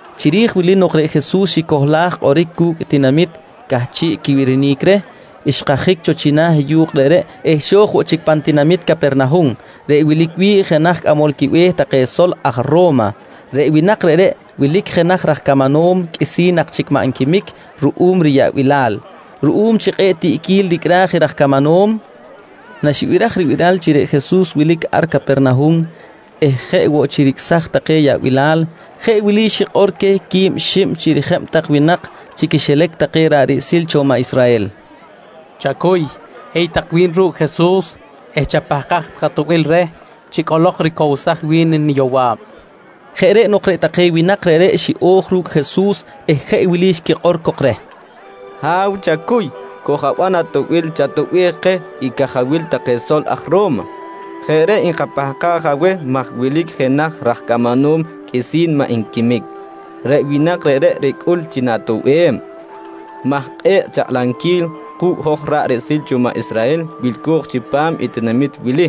Chiri̱j wili nok reꞌ Jesus xicohlaj kꞌoric cu̱cꞌ i tinamit cꞌahchiꞌ quibirinic reh, xkajic cho china̱ yu̱kꞌ reꞌreꞌ eh xo̱j woꞌ chic pan tinamit Capernahum reꞌ wilic wi̱ꞌ jenaj cꞌamol quibe̱h take sol aj Ro̱ma. Reꞌ winak reꞌreꞌ wilic jenaj raj camanom qꞌuisi̱n nak chic maꞌ nquimic ruꞌum riyaꞌbilal. Ruꞌum chi kꞌe̱ꞌ tiꞌquil ricꞌraj i raj camanom, naxibiraj ribiral chi reꞌ Jesus wilic ar Capernahum eh jeꞌ woꞌ chi ricꞌsaj take yaꞌbilal, jeꞌ wili xikꞌor queh quib xib chi rijeb tak winak chi quixilac take ra̱ꞌ riꞌsil cho maꞌ Israhel: «Chacuy, hiy tak wi̱n ru̱cꞌ Jesus eh chapahkaj tak atoꞌbil reh chi cꞌolok ricowsaj wi̱n niyowa̱b, nqui queh. Jeꞌ reꞌ nok reꞌ take winak reꞌreꞌ xiꞌo̱j ru̱cꞌ Jesus eh jeꞌ wili xquikꞌor cok reh: «Ha̱w chacuy, koj-aban atoꞌbil chatoꞌbej keh i cajawil take sol aj Ro̱ma. Jeꞌ reꞌ nkapahkaj aweh maj wilic jenaj raj camanom qꞌuisi̱n maꞌ nquimic. Reꞌ winak reꞌreꞌ ricꞌul chi na̱toꞌbem maj kꞌe̱ꞌ chakꞌlamquil ku̱cꞌ hoj ra̱ꞌ riꞌsil cho maꞌ Israhel wilco̱j chipam i tinamit wili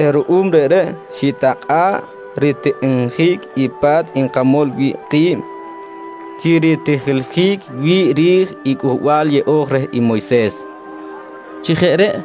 eh ruꞌum reꞌreꞌ xitakꞌa̱ꞌ ritikꞌinjic i pa̱t nkamol wi̱ꞌ ki̱b chi ritijiljic wi̱ꞌ ri̱j i Cꞌuhbal Yeꞌo̱j reh i Moyses, nqui take reh.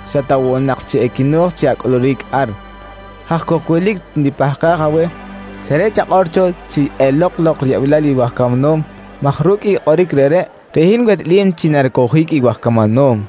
xa ta woꞌ nak chi equino̱j chi acꞌuluric ar. Haj cok wilic nipahkaj aweh, xa reꞌ chakꞌor cho chi elok lok riyaꞌbilal i waj camanom maj ru̱cꞌ i kꞌoric reꞌreꞌ, reꞌ hin wehtꞌalim chi naricowjic i waj camanom.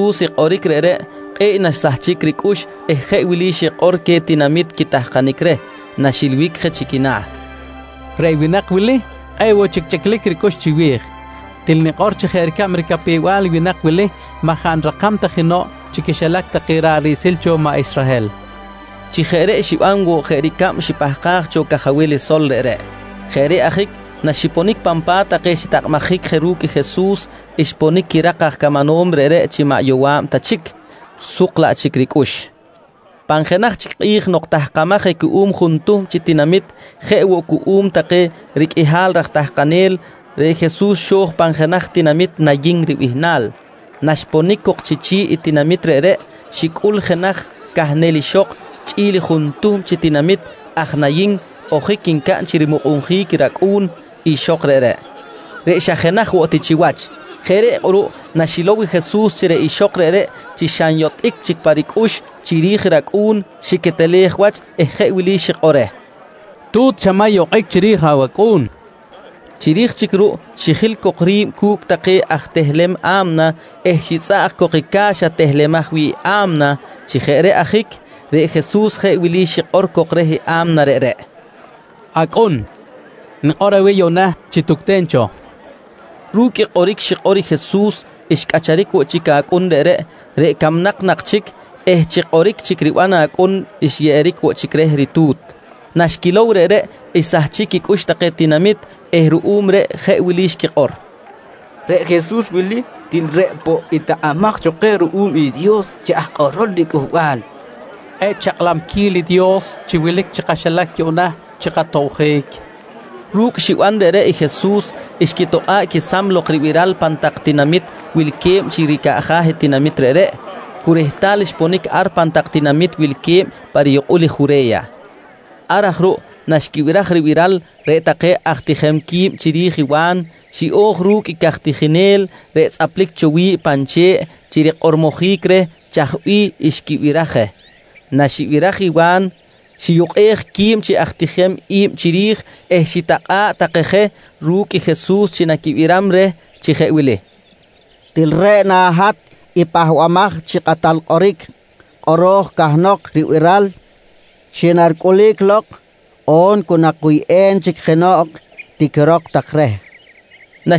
Naxibiraj Jesus i kꞌoric reꞌreꞌ, kꞌe̱ꞌ naxsahchic ricꞌux eh jeꞌ wili xikꞌor queh tinamit quitahkanic reh, naxilbic je chi quina̱: «Reꞌ winak wili, kꞌe̱ꞌ woꞌ chic chꞌiclic ricꞌux chiwi̱j. Til nikꞌor chi jeꞌ ricab ricapew-bal i winak wili, maꞌ jaꞌ nirakam ta jenoꞌ chi quixilac take ra̱ꞌ riꞌsil cho maꞌ Israhel, nqui Jesus. Chi jeꞌ reꞌ xiban woꞌ jeꞌ ricab xipahkaj cho cajawil sol reꞌreꞌ. Jeꞌ reꞌ ajic naxiponic pan pa̱t take xitakꞌabjic je ru̱cꞌ Jesus, xponic quirak aj camanom reꞌreꞌ chi maꞌ yowa̱b ta chic, suk laꞌ chic ricꞌux. Pan jenaj chic kꞌi̱j nok tahkamaj je cuꞌum juntuhm chi tinamit jeꞌ woꞌ cuꞌum take riqꞌuihal raj tahkanel, reꞌ Jesus xo̱j pan jenaj tinamit Nayin ribihnal. Naxponic cok chi chi̱ꞌ i tinamit reꞌreꞌ, xicꞌul jenaj cahnel ixok chꞌi̱l juntuhm chi tinamit aj Nayin ojic ncaꞌn chi rimukꞌunjic i racꞌu̱n ixok reꞌreꞌ, reꞌ xa jenaj woꞌ ti chiwach. Jeꞌ reꞌ kꞌuruꞌ naxilow i Jesus chi reꞌ ixok reꞌreꞌ chi xa nyotꞌic chic pa ricꞌux chiri̱j racꞌu̱n, xiquetelej wach eh jeꞌ wili xikꞌor reh: «Tu̱t, chamay okꞌic chiri̱j awacꞌu̱n, nqui reh. Chiri̱j chic ruꞌ xijil cok ri̱b cu̱cꞌ take aj tehlem a̱mna eh xitzꞌaꞌj cok i ca̱xa tehlemaj wi̱ꞌ i a̱mna. Chi jeꞌ reꞌ ajic reꞌ Jesus jeꞌ wili xikꞌor cok reh i a̱mna reꞌreꞌ: «Acꞌun, nikꞌor aweh yuꞌna chi tucten cho, nqui reh. Ru̱cꞌ kꞌoric xikꞌor i Jesus xcꞌacharic woꞌ chic acꞌun reꞌreꞌ, reꞌ camnak nak chic eh chi kꞌoric chic riban acꞌun xyeꞌeric woꞌ chic reh ritu̱t. Naxquilow reꞌreꞌ xsahchic quicꞌux take tinamit eh ruꞌum reꞌ jeꞌ wili xquikꞌor: «Reꞌ Jesus wili, til reꞌ poꞌ i takꞌamaj cho keh ruꞌum i Dios chi aj kꞌorol riCꞌuhbal. Kꞌe̱ꞌ chakꞌlamquil i Dios chi wilic chi kaxilac yuꞌna chi katobjic, nqui take. Ru̱cꞌ xiban reꞌreꞌ i Jesus, xquitokꞌa̱ꞌ quesam lok ribiral pan tak tinamit wilque̱b chi ricaꞌja̱ i tinamit reꞌreꞌ, cu rehtal xponic ar pan tak tinamit wilque̱b pa riyukꞌul Jure̱ya. Ar aj ruꞌ naxquibiraj ribiral reꞌ take aj tijem qui̱b chiri̱j i Wa̱n, xiꞌo̱j ru̱cꞌ i caj tijinel reꞌ tzꞌaplic cho wi̱ꞌ pan che̱ꞌ chi rikꞌormojic reh chaj bih xquibiraj je. Naxibiraj i Wa̱n, xiyukꞌej qui̱b chi aj tijem i̱b chiri̱j eh xitakꞌa̱ꞌ take je ru̱cꞌ i Jesus chi naquibiram reh chi jeꞌ wili: «Til reꞌ na hat i Pahbamaj chi Kꞌatal Kꞌoric kꞌoro̱j cahnok ribiral chi naricꞌulic lok on cu nakuyꞌem chic jenoꞌ? tiquirok tak reh, nqui je Wa̱n queh.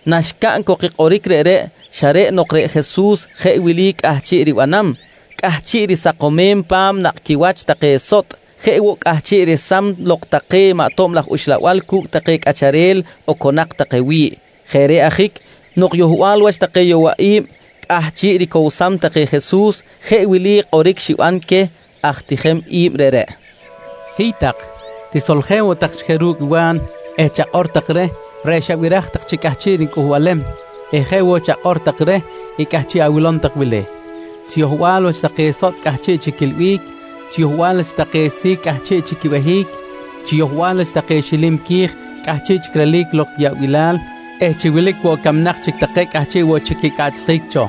Naxcaꞌn cok i kꞌoric reꞌreꞌ, xa reꞌ nok reꞌ Jesus jeꞌ wili cꞌahchiꞌ ribanam: Cꞌahchiꞌ risakomem pa̱m nakꞌ quiwach take sotꞌ. Jeꞌ woꞌ, cꞌahchiꞌ resam lok take maꞌ tob laj uxlabal cu̱cꞌ take cꞌacharel oconak take wi̱ꞌ. Jeꞌ reꞌ ajic nok yohbal wach take yowaꞌi̱b cꞌahchiꞌ ricowsam take Jesus, jeꞌ wili kꞌoric xiban queh aj tijem i̱b reꞌreꞌ: «Hiy tak, tisoljen woꞌ tak chic je ru̱cꞌ i Wa̱n eh chakꞌor tak reh reꞌ xabiraj tak chi cꞌahchiꞌ nicꞌuhbalem eh jeꞌ woꞌ chakꞌor take reh i cꞌahchiꞌ awilom tak wili: Chi yohbal wach take sotꞌ cꞌahchiꞌ chic quiꞌilbic, chi yohbal wach take si̱c cꞌahchiꞌ chic quibehic, chi yohbal wach take xilim qui̱j cꞌahchiꞌ chic relic lok quiyaꞌbilal eh chi wilic woꞌ camnak chic take cꞌahchiꞌ woꞌ chic quicꞌaꞌchsjic cho.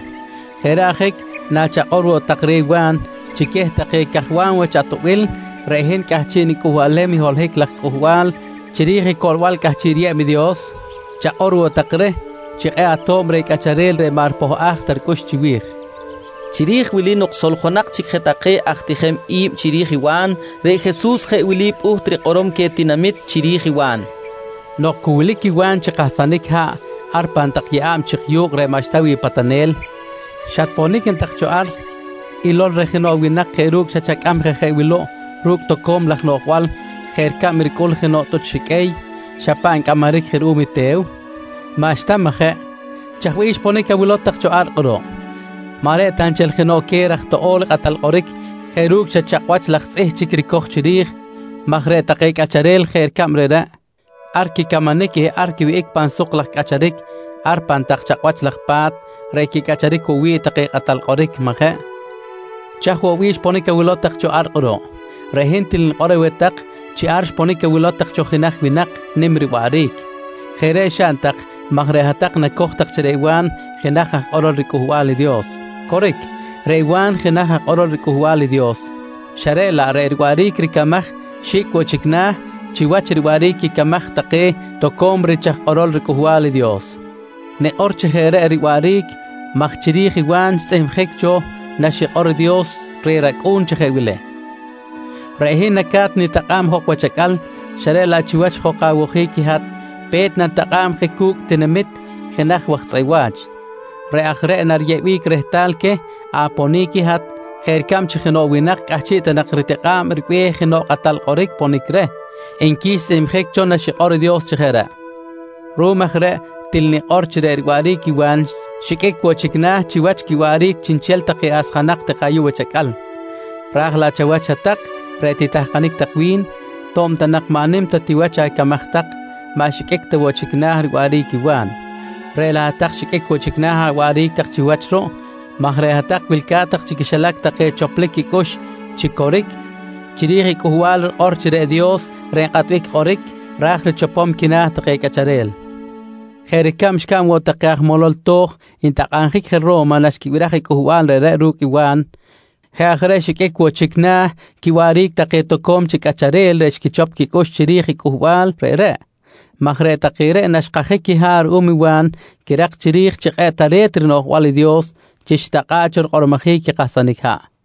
Jeꞌ reꞌ ajic nachakꞌor woꞌ tak reh Wa̱n chi queh take cajwam wach atoꞌbil reꞌ hin cꞌahchiꞌ nicꞌuhbalem i holohic laj cꞌuhbal chiri̱j i coꞌlbal cꞌahchiꞌ riyeb i Dios, chakꞌor woꞌ tak reh chi kꞌe̱ꞌ ato̱b reh cꞌacharel reꞌ maꞌ ripohꞌaj ta ricꞌux chiwi̱j, nqui Jesus queh. Chiri̱j wili nok soljonak chic je take aj tijem i̱b chiri̱j i Wa̱n, reꞌ Jesus jeꞌ wili pꞌuht rikꞌorom queh tinamit chiri̱j i Wa̱n: «Nok cu wilic i Wa̱n chi kahsanic haꞌ ar pan tak yeꞌa̱b chik yu̱kꞌ reꞌ maꞌxta wi̱ꞌ patanel, xatponic na tak cho ar ilol reh jenoꞌ winak jeꞌ ru̱cꞌ xa chacꞌam je jeꞌ wuluꞌ ru̱cꞌ toco̱m laj noꞌjbal jeꞌ ricab ricꞌul jenoꞌ tꞌuch xiqꞌuey xa paꞌ ncꞌamaric je ruꞌum i te̱w? Maꞌxta, majeꞌ? Chaj bih xponic awilow tak cho ar kꞌuruꞌ? Maꞌ reꞌ ta nchel jenoꞌ queh raj toꞌo̱l kꞌatal kꞌoric jeꞌ ru̱cꞌ xa chakꞌwach laj tzꞌih chic ricoj chiri̱j maj reꞌ take cꞌacharel jeꞌ ricab reꞌreꞌ, ar quicamanic eh quiwihꞌic pan suk laj cꞌacharic ar pan tak chakꞌwach laj pa̱t reꞌ quicꞌacharic woꞌ wi̱ꞌ take kꞌatal kꞌoric, majeꞌ? Chaj woꞌ bih xponic awilow tak cho ar kꞌuruꞌ? Reꞌ hin til nikꞌor aweh tak chi ar xponic awilow tak cho jenaj winak nim riwaꞌric. Jeꞌ reꞌ xaꞌn tak maj reꞌ hat-tak nacoj tak chi reꞌ Wa̱n jenaj aj kꞌorol riCꞌuhbal i Dios. Coric, reꞌ Wa̱n jenaj aj kꞌorol riCꞌuhbal i Dios xa reꞌ laꞌ reꞌ riwaꞌric ricamaj xi̱cꞌ woꞌ chic na̱ chiwach riwaꞌric quicamaj take toco̱m rich aj kꞌorol riCꞌuhbal i Dios. Nikꞌor chi jeꞌ reꞌ riwaꞌric maj chiri̱j i Wa̱n xtzꞌihmjic cho naxikꞌor i Dios reh rAcꞌu̱n chi jeꞌ wili: “Reꞌ hin naca̱t nitakꞌa̱b jok wach acꞌal, xa reꞌ laꞌ chiwach jok awojic i hat, pe̱t nanitakꞌa̱b je cu̱cꞌ i tinamit jenaj waj tzꞌeꞌ wa̱ch. Reꞌ aj reꞌ nariyeꞌbic rehtal queh aponic i hat jeꞌ ricab chi jenoꞌ winak cꞌahchiꞌ ta nak ritikꞌa̱ꞌ ribe̱h jenoꞌ kꞌatal kꞌoric ponic reh, nqui xtzꞌihmjic cho naxikꞌor i Dios chi jeꞌ reꞌ. «Ruꞌum aj reꞌ til nikꞌor chi reꞌ riwaꞌric i Wa̱n xiqꞌuic woꞌ chic na̱ chiwach quiwaꞌric chiꞌnchel take asjanak take ayuꞌ wach acꞌal. Raj laꞌ chawach hat-tak reꞌ titahkanic tak wi̱n to̱b ta nak maꞌ nim ta ti wach acamaj tak, maꞌ xiqꞌuic ta woꞌ chic na̱ riwaꞌric i Wa̱n, reꞌ laꞌ hat-tak xiqꞌuic woꞌ chic na̱ awaꞌric tak chiwach ruꞌ maj reꞌ hat-tak wilca̱t tak chi quixilac take choplic quicꞌux chi coric chiri̱j i cꞌuhbal rikꞌor chi reꞌ Dios reꞌ nkꞌatbic kꞌoric ra̱j richopom quina̱ take cꞌacharel, jeꞌ ricab xcaꞌn woꞌ take aj molol to̱j ntakꞌabjic je Ro̱ma naxquibiraj i cꞌuhbal reꞌreꞌ ru̱cꞌ i Wa̱n. Jeꞌ aj reꞌ xiqꞌuic woꞌ chic na̱ quiwaꞌric take toco̱m chic cꞌacharel reꞌ xquichop quicꞌux chiri̱j i cꞌuhbal reꞌreꞌ maj reꞌ take reꞌ naxkajic quiha̱ꞌ ruꞌum i Wa̱n xquirak chiri̱j chi kꞌe̱ꞌ tare̱t rinoꞌjbal i Dios chi xitakꞌa̱ꞌ cho rikꞌormojic i kahsanic haꞌ.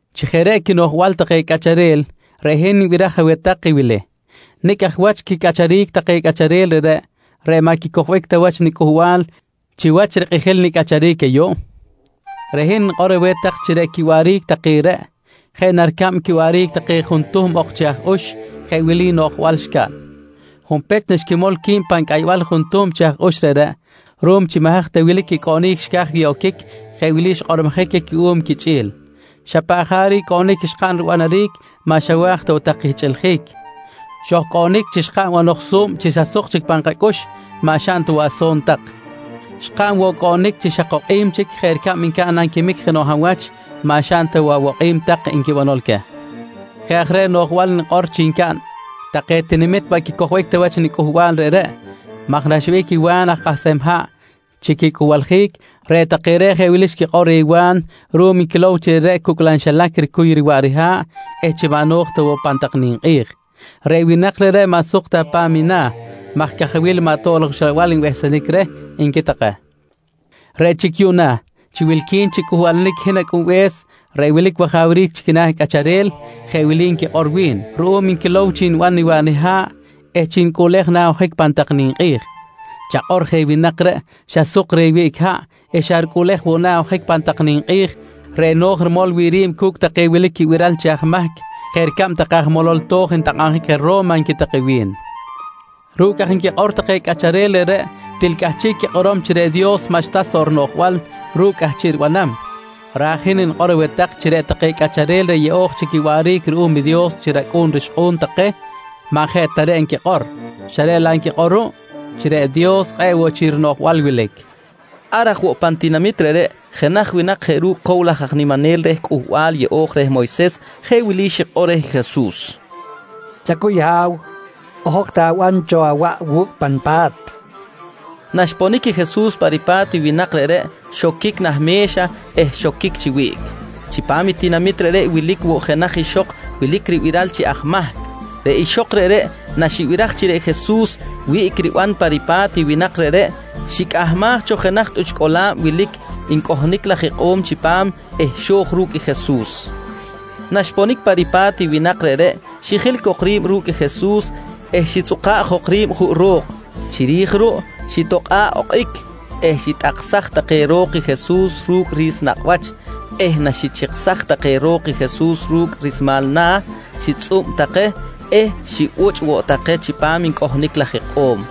«Chi jeꞌ reꞌ quinoꞌjbal take cꞌacharel reꞌ hin nibiraj aweh tak i wili: Nicꞌ aj wach quiwaꞌric take cꞌacharel reꞌreꞌ, reꞌ maꞌ quicojbic ta wach nicꞌuhbal chiwach rikꞌijil nicꞌacharic ayuꞌ? Reꞌ hin nikꞌor aweh tak chi reꞌ quiwaꞌric take reꞌ, jeꞌ na ricab quiwaꞌric take juntuhm ok chi aj ux jeꞌ wili noꞌjbal xcaꞌn: Junpech, naxquimol qui̱b pan cꞌaybal i juntuhm chi aj ux reꞌreꞌ, ruꞌum chi maꞌ haj ta wilic quicꞌoꞌnic xca̱j wi̱ꞌ oquic, jeꞌ wili xkꞌormojic queh cuꞌum quichꞌi̱l: ‹Xa paꞌ jaric cꞌoꞌnic xkaꞌn ribanaric maꞌ xawa̱j ta tak kihchꞌiljic. Xojcoꞌnic chi xkaꞌn banoj su̱b chi xa suk chic pan kacꞌux, maꞌ xaꞌn ta woꞌ aso̱n tak. Xkaꞌn woꞌ cꞌoꞌnic xa kokꞌim chic jeꞌ ricab ncaꞌn nanquimic jenoꞌ hab wach, maꞌ xaꞌn ta woꞌ awokꞌim tak, nqui banol queh. «Jeꞌ aj reꞌ noꞌjbal nikꞌor chi ncaꞌn take tinamit maꞌ quicojbic ta wach nicꞌuhbal reꞌreꞌ maj naxwihꞌic i Wa̱n aj kahsem haꞌ chi quicꞌuhbaljic, reꞌ take reꞌ jeꞌ wili xquikꞌor reh Wa̱n ruꞌum nquilow chi reꞌreꞌ cucꞌlam xilac ricuy riwaꞌ riha̱ꞌ eh chi maꞌ no̱j ta woꞌ pan tak ninkꞌi̱j: ‹Reꞌ winak reꞌreꞌ, maꞌ suk ta pa̱m na̱ maj cajawil maꞌ tob laj uxlabal nbehsenic reh, nqui take. «Reꞌ chic yuꞌna chi wilqui̱n chi cꞌuhbalanic i hin Acꞌunbe̱s reꞌ wilic wajawric chi quina̱ cꞌacharel, jeꞌ wili nquikꞌor wi̱n ruꞌum nquilow chi niban niwaꞌ niha̱ꞌ eh chi nicꞌuꞌlej na̱ ojic pan tak ninkꞌi̱j: ‹Chakꞌor je winak reꞌ, xa suk reh wiꞌc haꞌ eh xa ricꞌuꞌlej woꞌ na̱ ojic pan tak ninkꞌi̱j reꞌ no̱j rimol wi̱ꞌ ri̱b cu̱cꞌ take wilic quibiral chi aj mahc, jeꞌ ricab take aj molol to̱j ntakꞌabjic je Ro̱ma, nqui take wi̱n. «Ru̱cꞌ aj nquikꞌor take cꞌacharel reꞌreꞌ til cꞌahchiꞌ quikꞌorom chi reꞌ Dios maꞌxta soꞌ rinoꞌjbal ru̱cꞌ cꞌahchiꞌ ribanam, raj i hin nikꞌor aweh tak chi reꞌ take cꞌacharel reꞌ yeꞌo̱j chic quiwaꞌric ruꞌum i Dios chi racꞌu̱n rixkꞌu̱n take maꞌ jeꞌ ta reꞌ nquikꞌor, reꞌ laꞌ nquikꞌor ruꞌ chi reꞌ Dios kꞌe̱ꞌ woꞌ chic rinoꞌjbal wilic, nqui Jesus queh. Ar aj woꞌ pan tinamit reꞌreꞌ, jenaj winak jeꞌ ru̱cꞌ cow laj aj niminel reh Cꞌuhbal Yeꞌo̱j reh Moyses jeꞌ wili xikꞌor reh i Jesus: «Chacuy Ha̱w, ojok ti aban cho awaꞌ wu̱cꞌ pa nipa̱t, nqui reh. Naxponic i Jesus pa ripa̱t i winak reꞌreꞌ, xoquic nah me̱xa eh xoquic chi wiꞌc. Chipam i tinamit reꞌreꞌ wilic woꞌ jenaj ixok wilic ribiral chi aj mahc. Reꞌ ixok reꞌreꞌ naxibiraj chi reꞌ Jesus wiꞌc riban pa ripa̱t i winak reꞌreꞌ, xicꞌahmaj cho jenaj tꞌuch cꞌola̱b wilic ncꞌohnic laj ikꞌo̱m chipam eh xo̱j ru̱cꞌ Jesus. Naxponic pa ripa̱t i winak reꞌreꞌ xijil cok ri̱b ru̱cꞌ Jesus eh xitzꞌuka̱ꞌ jok ri̱b juꞌ ro̱k. Chiri̱j ruꞌ xitokꞌa̱ꞌ okꞌic, xitꞌaksaj take ro̱k i Jesus ru̱cꞌ ri̱s nakꞌ wach eh naxichiksaj take ro̱k i Jesus ru̱cꞌ rismal na̱, xitzꞌub take eh xibuchꞌ woꞌ take chipam ncꞌohnic laj ikꞌo̱m.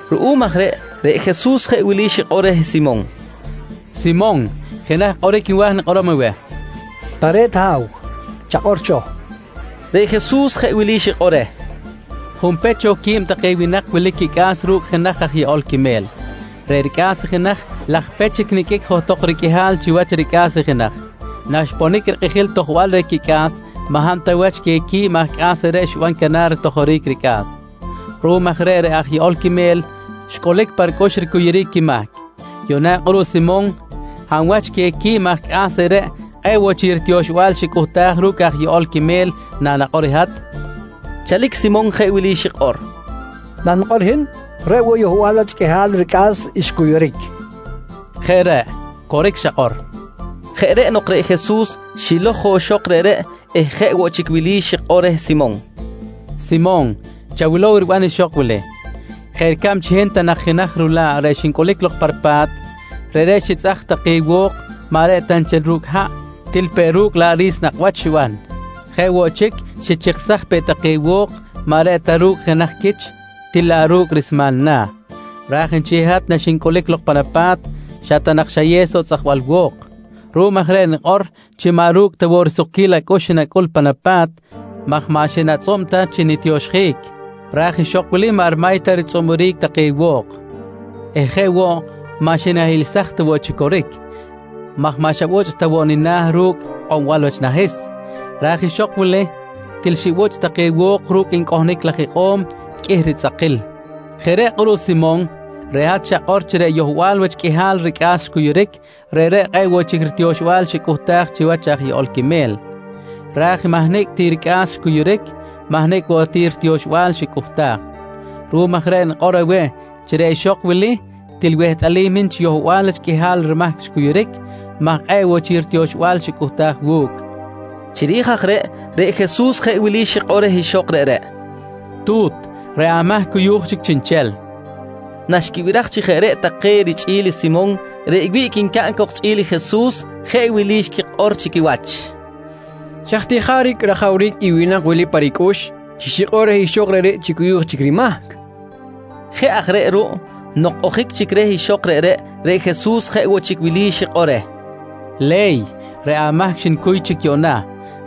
Ruꞌum aj reꞌ, reꞌ Jesus jeꞌ wili xikꞌor reh Simon: «Simon, jenaj kꞌoric nwa̱j nikꞌorom aweh, nqui reh. —Tare̱t Ha̱w, chakꞌor cho, nqui Simon. Reꞌ Jesus jeꞌ wili xikꞌor reh: «Junpech cho, quib take winak wilic quicꞌa̱s ru̱cꞌ jenaj aj yeꞌol quime̱l. Reꞌ ricꞌa̱s i jenaj, laj pech chic niqꞌuic johtok riqꞌuihal chiwach ricꞌa̱s i jenaj. Naxponic rikꞌijil i tojbal reh quicꞌa̱s, maꞌ hab ta wach queh quib aj cꞌa̱s reꞌreꞌ xiban canar ritojoric ricꞌa̱s. Ruꞌum aj reꞌ, reꞌ aj yeꞌol quime̱l xcꞌulic pa ricꞌux ricuyuric quimahc. Yuꞌna kꞌuruꞌ Simon, hab wach queh quib aj cꞌa̱s reꞌreꞌ kꞌe̱ꞌ woꞌ chic ritioxbal xicꞌuhtaj ru̱cꞌ aj yeꞌol quime̱l nanakꞌor i hat? nqui Jesus. Chalic Simon jeꞌ wili xikꞌor: «Nanikꞌor hin, reꞌ woꞌ i yohbal wach qꞌuihal ricꞌa̱s xcuyuric, nqui xikꞌor. —Jeꞌ reꞌ, coric xakꞌor, nqui Jesus. Jeꞌ reꞌ nok reꞌ Jesus xilow jok ixok reꞌreꞌ eh jeꞌ woꞌ chic wili xikꞌor reh Simon: «Simon, chawilow riban ixok wili: Jeꞌ ricab chi hin ta nak jenaj rula̱ꞌ reꞌ xincꞌulic lok pa ripa̱t, reꞌreꞌ xitzꞌaj take wo̱k maꞌ reꞌ ta nchel ru̱cꞌ haꞌ, til peꞌ ru̱cꞌ laꞌ ri̱s nakꞌ wach xiban. Jeꞌ woꞌ chic xichiksaj peꞌ take wo̱k maꞌ reꞌ ta ru̱cꞌ jenaj quich til laꞌ ru̱cꞌ rismal i na̱. Raj nchel hat naxincꞌulic lok pan apa̱t, xa ta nak xayew soꞌ tzꞌajbal wo̱k. Ruꞌum aj reꞌ nikꞌor chi maꞌ ru̱cꞌ ta woꞌ risukquil acꞌux xinacꞌul pan apa̱t maj maꞌ xinatzꞌub ta chi nitioxjic, raj ixok wili maꞌ rimay ta ritzꞌuburic take wo̱k eh jeꞌ woꞌ, maꞌ xinahiꞌlsaj ta chi coric maj maꞌ xabuchꞌ ta woꞌ nina̱ ru̱cꞌ ikꞌombal wach nahis, raj ixok wili til xibuchꞌ take wo̱k ru̱cꞌ ncꞌohnic laj ikꞌo̱m qꞌuih ritzꞌakil. Jeꞌ reꞌ kꞌuruꞌ Simon, reꞌ hat xakꞌor chi reꞌ yohbal wach qꞌuihal ricꞌa̱s xcuyuric, reꞌreꞌ kꞌe̱ꞌ woꞌ chic ritioxbal xicꞌuhtaj chiwach aj yeꞌol quime̱l, raj i mahnicꞌ ti ricꞌa̱s xcuyuric, mahnicꞌ woꞌ ti ritioxbal xicꞌuhtaj. Ruꞌum aj reꞌ nikꞌor aweh chi reꞌ ixok wili til wehtꞌalim i hin chi yohbal wach qꞌuihal rimahc xcuyuric maj kꞌe̱ꞌ woꞌ chic ritioxbal xicꞌuhtaj wu̱cꞌ, nqui Jesus reh. Chiri̱j aj reꞌ, reꞌ Jesus jeꞌ wili xikꞌor reh ixok reꞌreꞌ: «Tu̱t, reꞌ amahc cuyu̱j chic chiꞌnchel, nqui reh. Naxquibiraj chi jeꞌ reꞌ take richꞌi̱l i Simon reꞌ wiꞌc ncaꞌn cok chꞌi̱l Jesus, jeꞌ wili xquikꞌor chi quiwach: «Chaj ti jaric rajawric i winak wili pa ricꞌux chi xikꞌor reh ixok reꞌreꞌ chi cuyu̱j chic rimahc? nqui take chi quiwach. Jeꞌ aj reꞌ ruꞌ nok ojic chic reh ixok reꞌreꞌ, reꞌ Jesus jeꞌ woꞌ chic wili xikꞌor reh: «Le̱y, reꞌ amahc xnicuy chic yuꞌna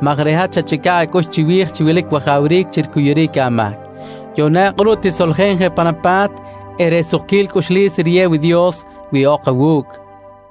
maj reꞌ hat xachꞌica̱ꞌ acꞌux chiwi̱j chi wilic wajawric chi ricuyuric amahc. Yuꞌna kꞌuruꞌ tisoljen je pan apa̱t eh reꞌ sukquil cꞌuxlis riyew i Dios wihꞌok awu̱cꞌ, nqui reh.